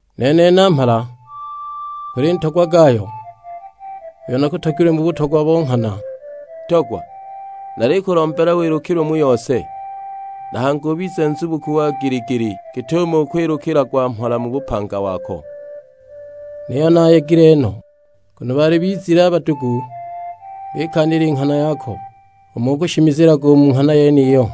Nene namhala; Kuli ntogwa Gayo, uyo nakutogilwe mu butogwa bo nghana. Ntogwa, nalikulombela wilukilwe mu yose, na hangi ubize nzubuku wa gili-gili, git'umo ukwilukilagwa mhola mu bupanga wako. Niyo naayegile no, nguno baali bizile badugu bikaanila i nghana yako, umo ukushimizilaga u mu nghana yeniyo.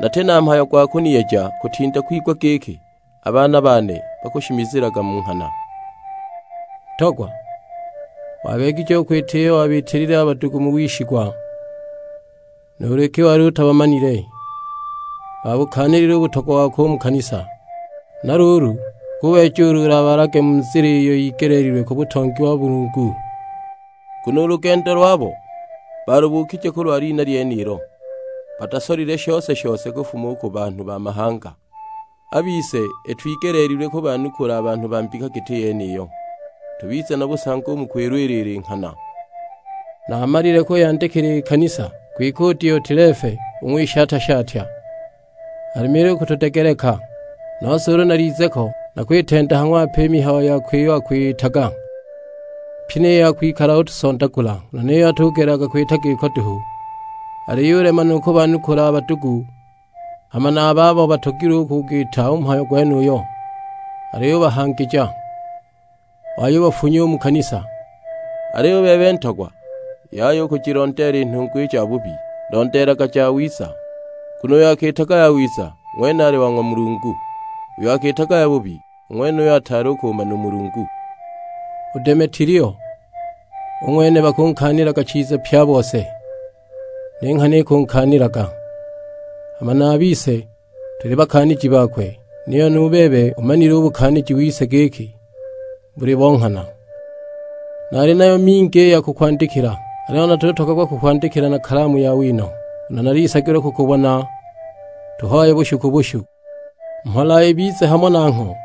Nati na mhayo gwa kuniyeja kutinda kwigwa giki a baana bane bakushimizilaga mu nghana. Ntogwa, wabeegije u kwita iyo wabiitilile a badugu mu wishigwa, nuulu iki wali utabamanile. Baabukaanilile u butogwa wako u mu kanisa; huna luulu ukubeeja ulu ulabalage mu nzila iyo yigeleelilwe ku butongi bo ng'wa Mulungu. Nguno u lugendo lwabo baalubukije kulwa lina lyenilo; batasolile shose-shose kufuma u ku banhu ba mahanga. A bise itwigeleelile kubanukula a banhu ba mbika giti yeniyo, tubize na busangi u mu kwilwilila i nghana. Naamalile kuyandikila i kanisa, kwike u Diotilefe u ng'wishatya-shatya alemile u kutudegeleka! Nose ulu nalize ko nakwitenda ha ng'wape i mihayo yakwe iyo akwiyitaga, pyi ni ya kwikala utusondagula; nguno niyo atugelelaga kwita giko duhu, aliyulema nu kubanukula a badugu, hama na a babo batogilwe u kugwita u mhayo gwenuyo aliyubahangija, wayubafunya u mu kanisa! Aliyo u bebe ntogwa yaya u kujilondeela i nhungwa i jabubi, londeelaga jawiza. Nguno uyo akiitaga yawiza ng'wene ali wa ng'wa Mulungu, uyo akiitaga yabubi, u ng'wenuyo ataali u kumana u Mulungu. U Demetilio u ng'wene bakunkaanilaga chiza pye a bose, ni nghana ikunkaanilaga, hama na a bise tuli bakaaniji bakwe; niyo nu bebe ubumanile u bukaaniji wise giki buli bo nghana. Nali nayo mingi i ya kukwandikila, aliyo natutogagwa kukwandikila na kalamu ya wino, nguno nalisagilwa kukubona tuhoye bushu ku bushu. Mhola ibize hamo nangho!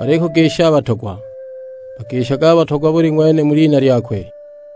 Balikugisha a batogwa. Bagishage a batogwa buli ng'wene mu lina lyakwe.